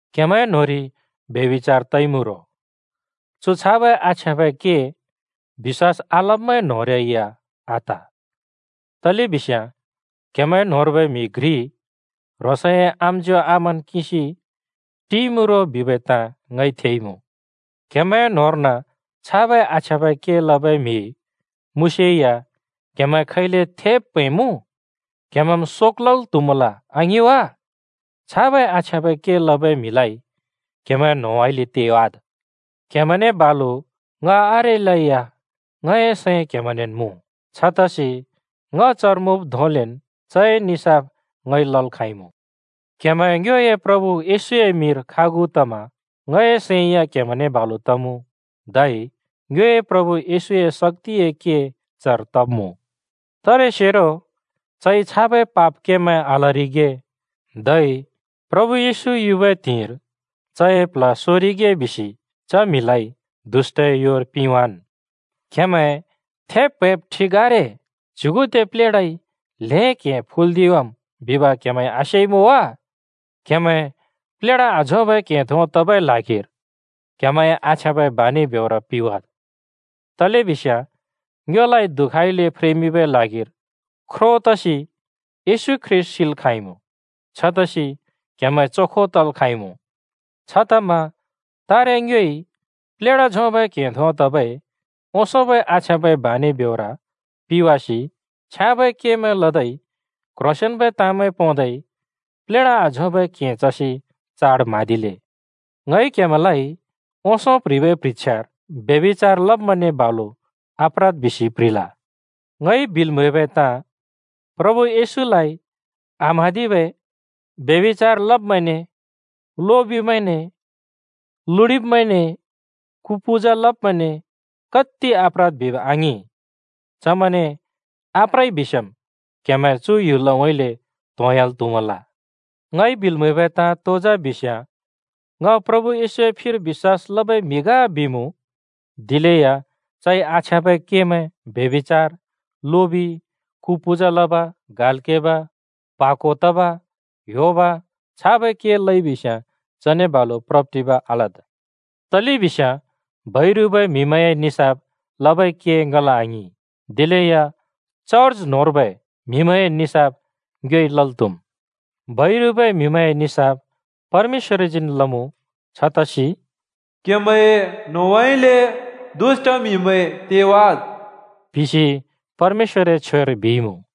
क्‍हेमैं न्‍होंरि ब्यभिचार तइमुँ रो, चु छाबै आछ्याँबै के बिश्‍वास आलब्‍मैं न्होंरै या आत। तलेबिस्याँ क्‍हेमैं न्‍होंर्बै म्‍हि घ्रि ह्रोंसए आम्‍ज्‍यों आमान् किंसि टिइमुँ रो बिबै ताँ ङइ थेइमुँ। क्‍हेमैं न्‍होंर्न छाबै आछ्याँबै के लबै म्हि मुँसेया क्‍हेमैं खैले थेब् प्‍हैंमुँ? क्‍हेमैंम् शोक लल् त्‍हुमल आङिं वा? छाबै आछ्याँबै के लबै म्हिलाइ क्‍हेमैंए न्‍होंउँइँले तेवाद्। क्‍हेमैंने बालु ङ आरेलै या ङए सैं क्‍हेमैंनेन् मुँ। छतसि ङ चर मुँब् धोंलेन् चए निसाफ ङइ लल् खाँइमुँ। क्‍हेमैं ङ्योए प्रभु येशूए मिंर खागु तमा ङए सैं या क्‍हेमैंने बालु तमुँ। धै ङ्योए प्रभु येशूए शक्‍तिए के चर तब्मुँ। तारेसेरो चइ छाबै पाप केमैं आलरिगे, धै प्रभु येशू युबै त्हिंइर चए प्ल्ह सोरिगे बिसि च म्हिलाइ दुष्‍टए योर पिंवाँन्। क्हेमैं थेब् प्‍हैंब ठिक आरे। च्युगुदे प्लेढाइ ल्हें क्हें फुल्दिवाम् बिब क्‍हेमैंइ आसेइमुँ वा? क्‍हेमैं प्लेढा आझोंबै क्हें धों तबै ल्हागिर क्हेमैंए आछ्याँबै बानि ब्योर पिवाद्। तलेबिस्याँ ङ्योलाइ दुःखइले फ्रेमिंबै ल्हागिर ख्रो तसि येशू ख्रीष्‍ट सिल् खाँइमुँ। छतसि क्‍हेमैं चोखो तल् खाँइमुँ। छतमा तारे ङ्योइ प्लेढा झोंबै क्हें धों तबै ओंसोंबै आछ्याँबै बानि ब्योर पिवासि छ्याँबै केमैं लदै क्ह्रोंसेंन्बै ताँमैं पोंदै प्लेढा आझोंबै क्हें चसि चाड म्हाँदिले। ङइ क्‍हेमैंलाइ ओंसों प्‍ह्रिबै प्ह्रिछ्यार ब्यभिचार लब्‍मैंने बालु आप्रद् बिसि प्‍ह्रिल। ङइ बिल् म्हैबै ताँ, प्रभु येशूलाइ आम्हाँदिबै ब्यभिचार लब्‍मैंने, लोबिमैंने, लुडिब्मैंने, कु पूजा लब्‍मैंने कत्ति आप्रद् बिब आङिं। चमैंने आप्रइ बिस्याँम् क्‍हेमैं चु ह्‍युलउँइँले त्‍होंह्‍याल् त्‍हुमल। ङइ बिल् म्हैबै ताँ तो जा बिस्‍याँ, “ङ प्रभु येशूए फिर बिश्‍वास लबै म्हि ग” बिमुँ दिलेया चइ आछ्याँबै केमैं, व्यभिचार, लोबि, कु पूजा लब, गाल् केब, प्हा को तब, ह्‍योब, छाबै के लइबिस्‍याँ चने बालु प्रब्-टिब आलद्। तलेबिस्याँ बैरुबै म्हिमैंए निसाफ लबै के ङल आङिं। दिलेया चर्ज न्होंर्बै म्हिमैंए निसाफ ङ्योइ लल् त्हुम्। बैरुबै म्हिमैंए निसाफ परमेश्‍वरजीन् लमुँ। छतसि “क्‍हेमैंए न्होंउँइँले दुष्‍ट म्हिमैं तेवाद्।” बिसि परमेश्‍वरए छ्वेर बिइमुँ।